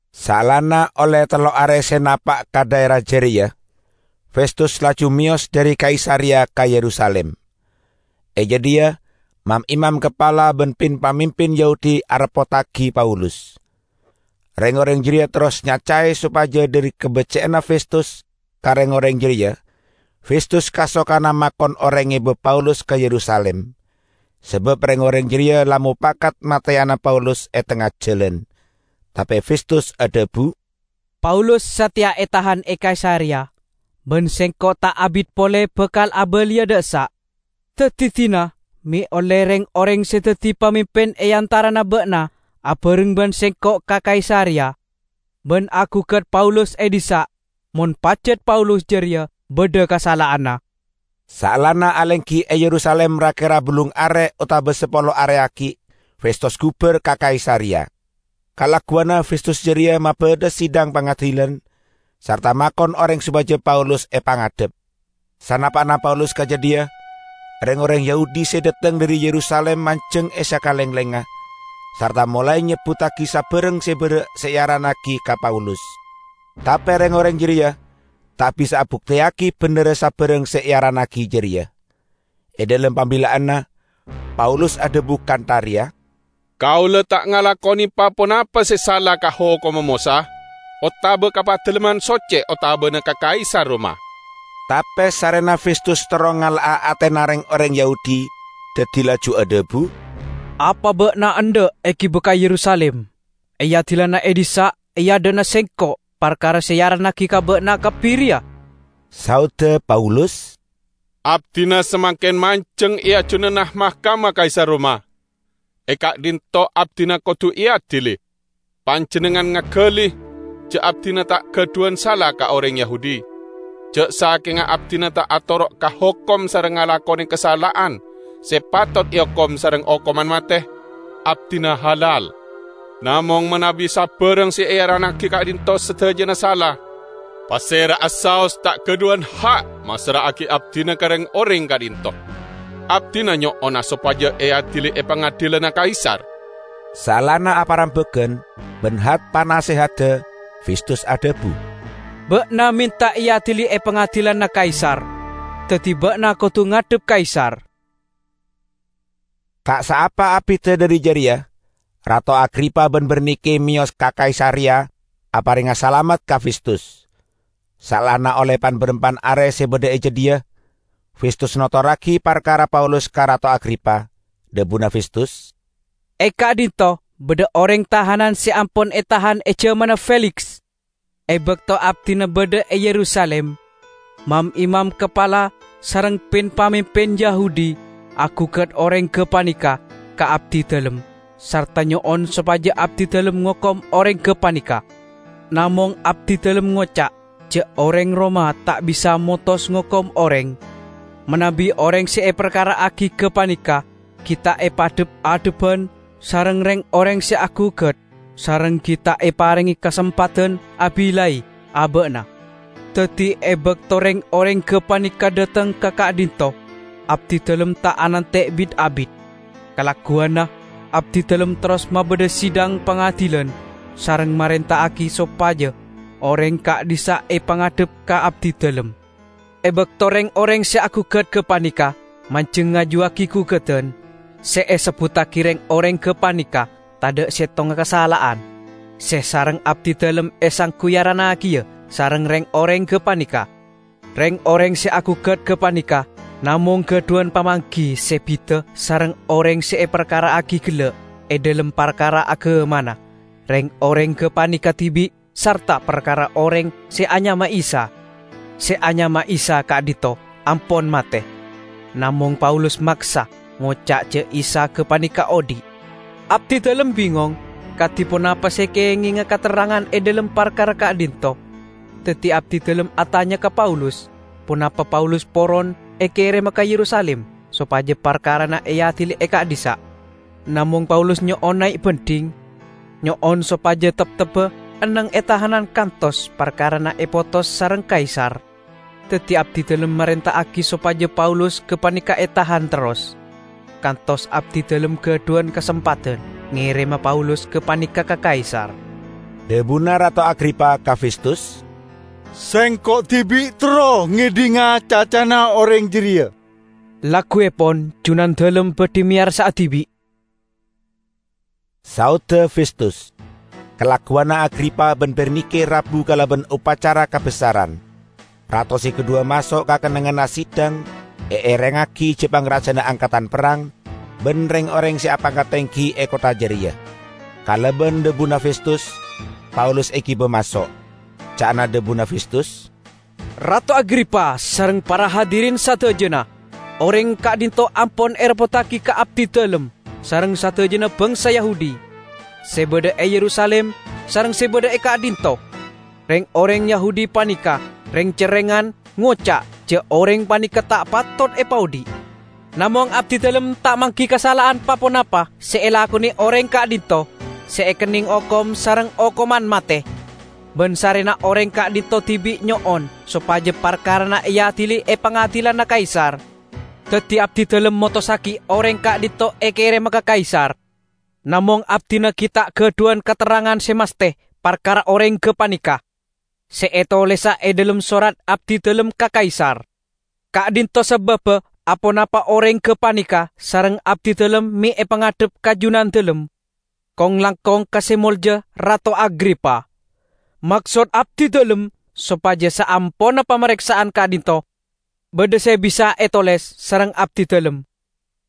Saellana olle tello are se napa' ka dhaera jareya, Festus laju meyos dhari Kaisareya ka Yerusalim. E jadhiya mam-imam kapala ban pin-pamimpin Yahudi areppottagi Paulus. Reng-oreng jareya terros nyacae sopaja dhari kabecce'anna Festus ka reng-oreng jareya Festus kasokana makon oreng ngeba Paulus ka Yerusalim; sabab reng-oreng jareya la mopakat mateyana Paulus e tengnga jalan. Tape Festus adhabu, "Paulus sateya etahan e Kaisareya; ban sengko' ta' abit pole bakal abaliya dha' essa'. Daddi, dina me' olle reng-oreng se daddi pamimpin e antarana ba'na abareng ban sengko' ka Kaisareya, ban agugat Paulus e dhissa' mon pajat Paulus jareya badha kasala'anna." Saellana alenggi e Yerusalim ra-kera ballung are otaba sapolo are aggi', Festus gubar ka Kaisareya. Kalagguwanna Festus jareya mabadha sidang pangadilan, sarta makon oreng sopaja Paulus epangadhep. Sanapa'na Paulus ka jadhiya, reng-oreng Yahudi se dhateng dhari Yerusalim manjeng e sakalenglengnga, sarta molae nyebbuttagi sabarang se berra' se earannagi ka Paulus. Tape reng-oreng jareya ta' bisa abukteyagi bendherra sabarang se earannagi jareya. E dhalem pambilla'anna, Paulus adhabu kantha reya, "Kaula ta' ngalakone pa-ponapa se sala ka hokomma Mosa otaba ka Padalemman Socce otabana ka Kaisar Roma." Tape sarrena Festus terro ngala'a atena reng-oreng Yahudi, daddi laju adhabu, "Apa ba'na endha' egiba ka Yerusalim, eadilana e dhissa' e adha'na sengko' parkara se earannagi ka ba'na kabbi reya?" Saodda Paulus, "Abdina samangken manjeng e ajunanna mahkamah Kaisar Roma; e ka'dhinto' abdina kodu eadili. Panjennengngan ngagali ja' abdina ta' gadhuwan sala ka oreng Yahudi. Ja' sakenga abdina ta' atoro' ka hokom sareng ngalakone kasala'an se patot eokom sareng okoman mate, abdina halal. Namong manabi sabarang se earannagi ka'dhinto' sadajana sala, pasera'a saos ta' gadhuwan ha' massra'agi abdina ka reng-oreng ka'dhinto'. Abdina nyo'ona sopaja eadili e pangadilanna Kaisar!" Saellana aparembagan ban hat-panasehadda, Festus adhabu, "Ba'na menta eadili e pangadilanna Kaisar, daddi ba'na kodu ngadhep Kaisar." Ta' saapa abidda dhari jareya, Rato Agripa ban Bernike meyos ka Kaisareya aparenga salamet ka Festus. Saellana olle pan-barampan are se badha e jadhiya, Festus notorragi parkarana Paulus ka Rato Agripa. Dhabuna Festus, "E ka'dhinto' badha oreng tahanan se ampon etahan e jamanna Feliks. E bakto abdina badha e Yerusalim, mam-imam kapala sareng pin-pamimpin Yahudi agugat oreng gapaneka ka abdidalem sarta nyo'on sopaja abdidalem ngokom oreng gapaneka. Namong abdidalem ngoca' ja' oreng Roma ta' bisa motos ngokom oreng, manabi oreng se eparkara'agi gapaneka gi' ta' epadhep-adhebban sareng reng-oreng se agugat sareng gi' ta' eparenge kasempadan abillai aba'na. Daddi, e bakto reng-oreng gapaneka dhateng ka ka'dhinto', abdidalem ta' anante' bit-abit. Kalagguwanna abdidalem terros mabadha sidang pangadilan sareng marenta'agi sopaja oreng ka'dhissa' epangadhep ka abdidalem. E bakto reng-oreng se agugat gapaneka manjeng ngajuwagi gugadan, se esebbuttagi reng-oreng gapaneka tadha' settonga kasala'an se sareng abdidalem esanggu earannagiya sareng reng-oreng gapaneka. Reng-oreng se agugat gapaneka namong gadhuwan pamanggi se bida sareng oreng se eparkara'agi gella' e dhalem parkara agamana reng-oreng gapaneka dibi' sarta parkara oreng se anyama Isa. Se anyama Isa ka'dhinto' ampon mate, namong Paulus maksa ngoca' ja' Isa gapaneka odhi'. Abdidalem bingong kadi ponapa se kengenga katerrangan e dhalem parkara ka'dhinto', daddi abdidalem atanya ka Paulus ponapa Paulus poron ekerema ka Yerusalim sopaja parkarana eadili e ka'dhissa'. Namong Paulus nyo'on nae' bandhing, nyo'on sopaja teptebba enneng e tahanan kantos parkarana epotos sareng Kaisar. Daddi abdidalem marenta'agi sopaja Paulus gapaneka etahan terros, kantos abdidalem gadhuwan kasempadan ngerema Paulus gapaneka ka Kaisar." Dhabuna Rato Agripa ka Festus, "Sengko' dibi' terro ngedhinga cacana oreng jareya." "Lagguepon junandalem badhi meyarsa'a dibi'," saodda Festus. Kalagguwanna Agripa ban Bernike rabu kalaban opacara kabessaran. Rato se kadhuwa maso' ka kennengnganna sidang eerengngagi ja-pangrajana angkadan perrang, ban reng-oreng se apangkat tenggi e kottha jareya. Kalaban dhabuna Festus, Paulus egiba maso'. Ca'na dhabuna Festus, "Rato Agripa sareng para hadirin sadajana! Oreng ka'dhinto' ampon ereppottagi ka abdidalem sareng sadajana bangsa Yahudi, se badha e Yerusalim sareng se badha e ka'dhinto'. Reng-oreng Yahudi paneka reng-cerrengan ngoca' ja' oreng paneka ta' patot epaodhi'. Namong abdidalem ta' manggi kasala'an pa-ponapa se elakone oreng ka'dhinto' se ekenneng okom sareng okoman mate. Ban sarrena oreng ka'dhinto' dibi' nyo'on sopaja parkarana eadili e pangadilanna Kaisar, daddi abdidalem motossagi oreng ka'dhinto' ekerema ka Kaisar. Namong abdina gi' ta' gadhuwan katerrangan se masthe parkara oreng gapaneka, se etolesa e dhalem sorat abdidalem ka Kaisar. Ka'dhinto' sababba aponapa oreng gapaneka sareng abdidalem me' epangadhep ka junandalem, kong-langkong ka Se Molja Rato Agripa! Maksod abdidalem, sopaja saamponna pamareksa'an ka'dhinto', badha se bisa etoles sareng abdidalem.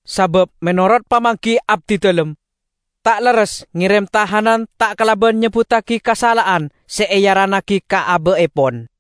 Sabab menorot pamanggi abdidalem, ta' lerres ngerem tahanan ta' kalaban nyebbuttagi kasala'an se earannagi ka aba'epon."